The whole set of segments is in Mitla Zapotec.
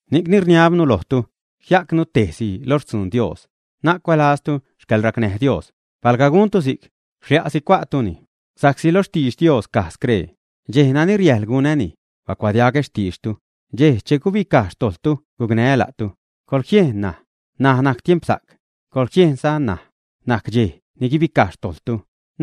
Ni'cni rniabnu lojtu, jia'cnu tejsi lo xtzun Dios, na'c cuälaztu xcäḻracnäj Dios; palga guntu si'c, xlia'si cua'tuni. Sa'csi loj xtidx Dios caj scree: Dxej nani riäjḻ gunäni, bacuadiagä xtiidxtu, dxej che gubicaj xtojḻtu gucnää́ la'tu. ¡Coḻjiejn! N̲aj najc te tiempsa'c, coḻjiejnza, ṉaj najc dxej ni guibicaj xtojḻtu.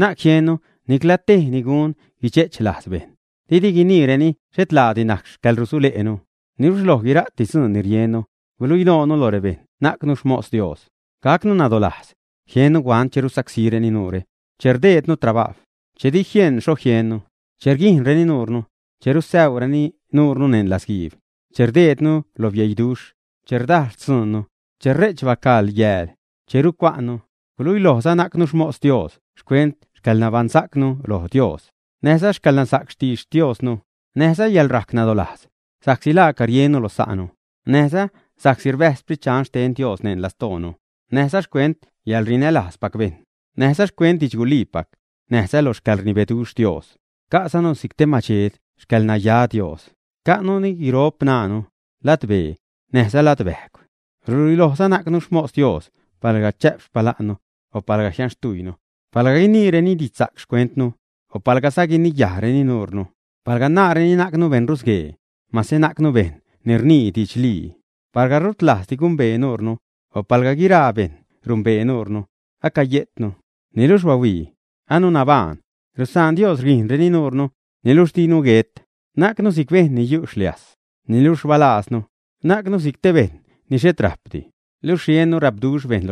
Na'c jiennu nicla tej ni gun guidxe'ch lajz bejṉ, didi guiniireni xhet laadi najc xcäḻrusule'nu. Niluxh lo guira'ti dzuun ni riennu, guluilojnu lo rebejṉ najcnu xmos Dios; gacnu nadolajz; jiennu huant che rusacsíreni nuure; che rdejdnu trabajw; che di jieṉ xho jiennu; che rguijṉreni nuure; che rusäureni nuure neṉ latzguiib; che rdejdnu lo bieiduxh; che rdajl xtzuunnu; che re'ch bacaḻ yääl; che rucua'nnu; guluilojza najcnu xmos Dios xcuent xcäḻnabaṉsa'cnu lo Dios; näjza xcäḻnansa'c xtidx Diosnu; näjza yäḻrajc nadolajz; sa'csi laaca riennu lo sa'nu; näjza sa'csi rbäjz Sprit Dxan xten Dios neṉ lastoonu; näjza xcuent yäḻrinälajzpac bejṉ; näjza xcuent didxguliipac; näjza lo xcäḻrnibeduxh Dios; ca'zanu si'c te madxed xcäḻnaya Dios, ca'nuni guropṉaanu, ladbee, näjza ladbäjgw. Ruluilojzanu najcnu xmos Dios palga chä'p xpala'nnu, o palgaza jianxtujynu; palga guiniireni didxsa'c xcuentnu, o palgaza guiniyajreni nuunu; palga naareni najcnu beṉrusguee, mase najcnu bejṉ ni rnii didxlii. Palga rut rlajzdi gumbee nuunu, o palga guira'ti bejṉ numbee nuunu; acayejtnu, niluxh bahuii, anu anabajṉ; rusaan Dios rguijṉreni nuure, niluxh dinu guet; najcnu si'c bejṉ ni yu' xliajs, niluxh rbalaaznu; najcnu si'c bejṉ ni xhet rajpdi, luxh riennu gapduxh bejṉ;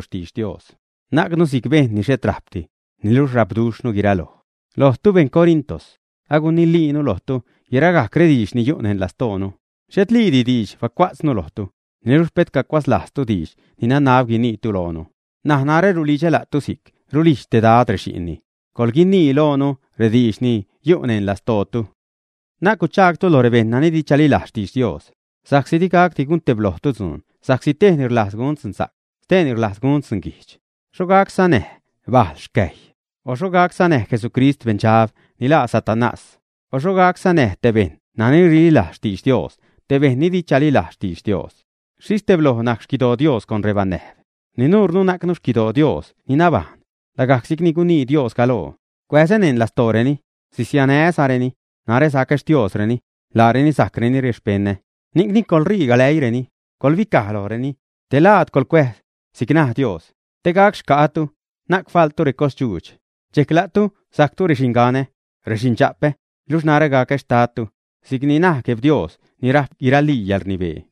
najcnu si'c bejṉ ni xhet rajpdi, niluxh rajpnu guiraloj. Lojtu, beṉ Corinto, aguniliinu lojtu guiragajc rediidx ni yu' neṉ lastoonu. Xhetliidi diidxdi bacua'tznu lojtu, niluxh pet cacuatz lajztu diidx ni nanab guiniitu loonu. N̲aj narä rulidxä la'tu si'c rulijdx te Dad rexi'nni: ¡Coḻguinii loonu rediidx ni yu' neṉ lastootu! Na'c guchaagtu lo rebejṉ nani di chalilajz xtidx Dios, sa'csi di gacdi gunteblojtu dzuun sa'csi tejni rlajz gun dzunsa'c, steeni rlajz gunni dzunguijdx, ¿xho gac sanäj bajl xcäjy, ä? O ¿xho gac sanäj Jesucrist beṉdxab ni laa Satanás, ä? O ¿xho gac sanäj te bejṉ nani rililajz xtidx Dios te bejṉ ni di chalilajz xtidx Dios, ä? ¿Xhixh tebloj najc xquidoo Dios con rebanäjb, ä? Ni nuunu najcnu xquidoo Dios ni nabajṉ, lagajc si'cni gunii Dios galoo: Cuäzä neṉ lastooreni, sisianää́zareni. Narä sacä Xtiosreni, laareni sajcreni rexpeṉä. Ni'cni coḻṟii galäiireni, coḻguibicaj lojreni, te laad coḻcuääz, si'c naj Dios: Te gac xca'ätu, na'c faḻtu recosdxuudx. Dxejc la'tu sajctu rexinganä, rexindxa'pä, luxh narä gacä xtadtu, si'c naj Gueb Dios ni rajp guiralii yäḻrnibee.